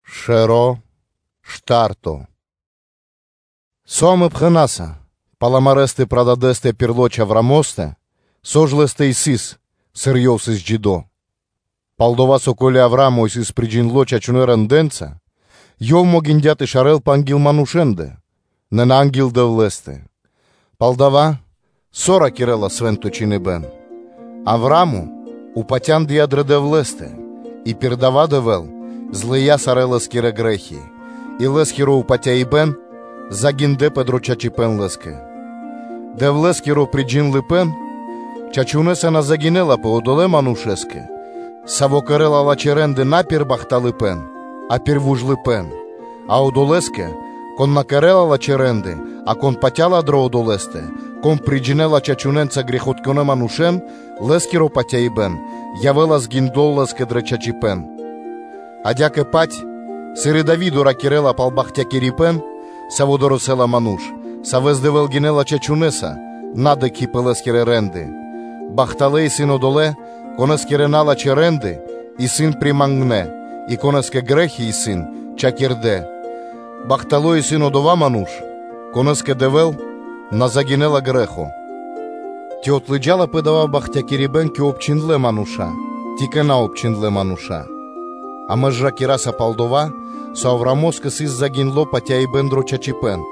Авраамо́скиро Приме́ро (Сыкаибэ́н) Со амэ пхэна́са, пал амарэ́ прададэстэ пир лоч (плоть) Авраамостэ, со ж лэ́стэ сыс, сыр ёв исыс джидо́. Пал-дова́ со, ко́ли Авраа́мо исыс приджиндло чачунэса рэндэ́нца (делэнца), ёв могиндя́ тэ шарэлпэ анги́л манушэ́ндэ, нэ на анги́л Дэвлэ́стэ; палдава́ со ракирэ́ла Свэ́нто Чхиныбэ́н? “Авраа́мо упатяндыя дрэ Дэвлэ́стэ, и пир дава́ Дэвэ́л злыя́ сарэ́ лэ́скирэ грэ́хи, и лэ́скиро упатяибэн загиндяпэ дро чачипэ́н лэ́скэ.” Дэвлэ́скиро приджиндлыпэн чачунэса на загинэлапэ одолэ́ манушэ́скэ, саво́ кэрэ́ла лачхэ́ рэ́нды на пир бахталыпэ́н, а пир вужлыпэ́н; а одолэ́скэ, кон на кэрэ́ла лачхэ́ рэ́нды, а кон патя́ла дрэ Одолэ́стэ, Кон приджинэла чачунэнца грэхитконэ́ манушэ́н, лэ́скиро патяибэ́н явэ́ла загиндло лэ́скэ дрэ чачипэ́н. Адя́кэ-паць, сыр и Дави́до ракирэ́ла пал бахтякирибэ́н, саво́ дорэсэ́ла (долэла) ману́ш, савэ́с Дэвэ́л гинэ́ла чачунэса, на дыкхи́ пэ лэ́скирэ рэ́нды: “Бахталэ́ исын одолэ́, конэскирэ налачхэ́ рэ́нды исын примангнэ и конэ́скэ грэ́хи исын чхакирдэ; бахтало́ исын одова́ ману́ш, конэ́скэ Дэвэ́л на загинэла грэ́хо.” Ци отлыджалапэ дава́ бахтякирибэ́н кэ обчхиндлэ́ мануша́, ци кэ наобчхиндлэ мануша́? Амэ ж ракираса пал дова́, со Авраамо́скэ сыс загиндло патяибэ́н дро чачипэ́н.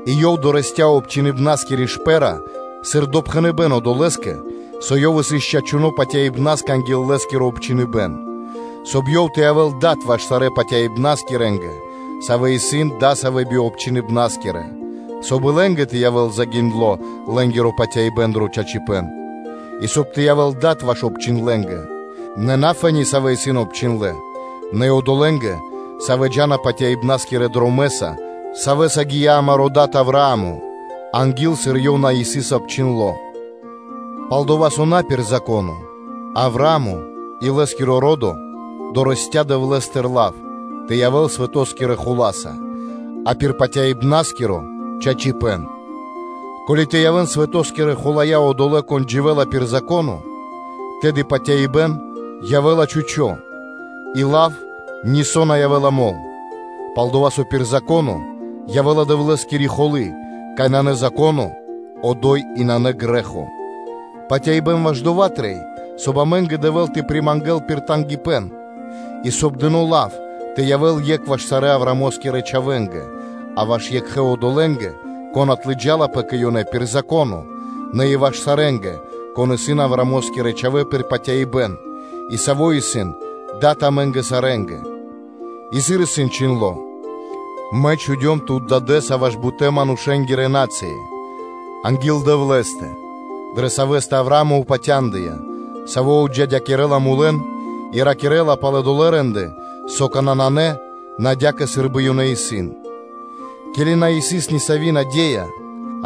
И ёв дорэсця́ (долыя) обчхиныбнаскири шпэ́ра (знако) сыр допхэныбэ́н долэ́скэ, со ёв сыс чачуно́ патяибна́скэ анги́л лэ́скиро обчхиныбэн, соб (кай) ёв тэ явэ́л дад ваш сарэ́ патяибна́скирэ́нгэ, савэ́ исын дасавэ́ би обчхиныбнаскирэ, соб (кай) и лэ́нгэ тэ явэ́л загиндло лэ́нгиро патяибэ́н дро чачипэ́н; и соб (кай) тэ явэ́л дад и ваш обчхиндлэнгэ, нэ фэ́ни, савэ́ исын обчхиндлэ́, нэ и одолэ́нгэ, савэ́ джа́на патяибна́скирэ́ дромэ́са, савэ́са гия́ амаро́ дад Авраа́мо анги́л, сыр ёв на сыс обчхиндло. Палдова́ со на пир Зако́но Авраа́мо и лэ́скиро ро́до дорэсця́ (долыя) Дэвлэ́стыр лав тэ явэ́л свэто́скирэ хула́са, а пирда́л патяибнаскиро чачипэ́н. Ко́ли тэ явэ́н свэто́скирэ хуланца одолэ́, кон дживэ́ла пир Зако́но, тэды патяибэ́н явэ́ла чхучо́ (пусто) и лав нисо́ на явэ́ла мол. Пал-дова́ со пир Зако́но явэ́ла Дэвлэ́скири холы́, кай нанэ Зако́но, одо́й и нанэ грэ́хо. Патяибэ́н ваш дова́ трэй, соб (кай) амэ́нгэ Дэвэ́л тэ примангэл пир тангипэ́н, и соб (кай) дыно́ лав тэ явэ́л екх ваш сарэ́ Авраамо́скирэ родо́скэ, а ваш екхэ одолэ́нгэ, кон отлыджалапэ кэ ёнэ пир Зако́но, нэ и ваш сарэ́нгэ, кон исын Аврамоскирэ чхавэ́ пир патяибэ́н и саво́ исын дад амэ́нгэ сарэ́нгэ, и сыр исын чхиндло́: “Мэ чхудём тут дадэ́са ваш бутэ́-манушэ́нгирэ на́цыи” анги́л Дэвлэ́стэ, дрэ Савэ́стэ Авраа́мо упатяндыя, Саво́ отджидякирэла мулэн, и ракирэ́ла пал долэ́ рэ́нды, со какана́ нанэ, нэ адя́кэ сы́рбы ёнэ исын; ке́ли на сыс нисави́ наде́я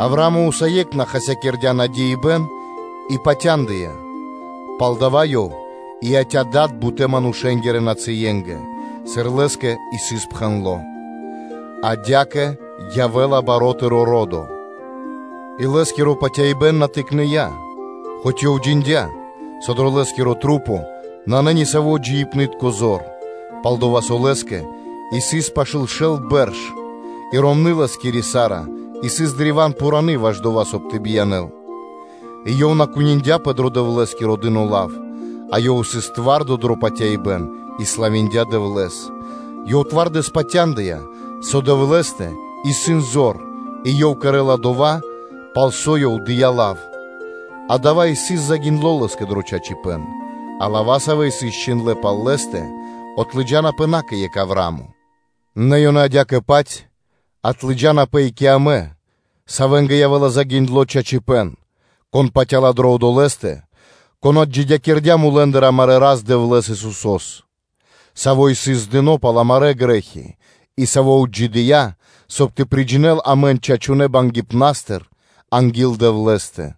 Авраамо́скэ, усае́кх ёв на хаськирдя надеиныбэн и патяндыя, палдава́ ёв и яця́ дадэ́са бутэ́ манушэ́нгирэ нацые́нгэ, сыр лэ́скэ сыс пхэндло́: “Адя́кэ явэ́ла баро́ тыро́ ро́до.” И лэ́скиро патяибэ́н на тыкныя, хоць ёв джиндя́, со дрэ лэ́скирэ маса́ нанэ ни сави́ джиибнытко зор, пал-дова́ со лэ́скэ исыс пашы́л шэл бэрш и ромны́ лэ́скири Сара сыс древа́н пхури ваш дава́, соб (кай) тэ биянэ́л, и ёв на куниндяпэ дрэ Дэвлэ́скиро дыно́ лав, а ёв сыс твардо дро патяибэ́н и славиндя Дэвлэ́с, Ёв древа́н патяндыя, со Дэвлэ́стэ исын зор, и ёв кэрэ́ла дова́, пал со Ёв дыя́ лав; дава́ и сыс загиндло лэ́скэ дро чачипэ́н. А лава́, савэ́ исыс чхиндлэ́ пал лэ́стэ, отлыджанапэ на кэ екх Авраа́мо. Нэ ёнэ адя́кэ-паць отлыджанапэ и кэ амэ, савэ́нгэ явэ́ла загиндло чачипэ́н, кон патя́ла дрэ Одолэ́стэ, Кон отджидякирдя́ мулэ́ндыр, амарэ́ Рас-Дэвлэ́с, Исусо́с, Саво́ сыс здыно пал амарэ́ грэ́хи и Саво́ отджидыя́, соб (кай) тэ приджинэл амэн чачунэнца бангипнастыр анги́л Дэвлэ́стэ.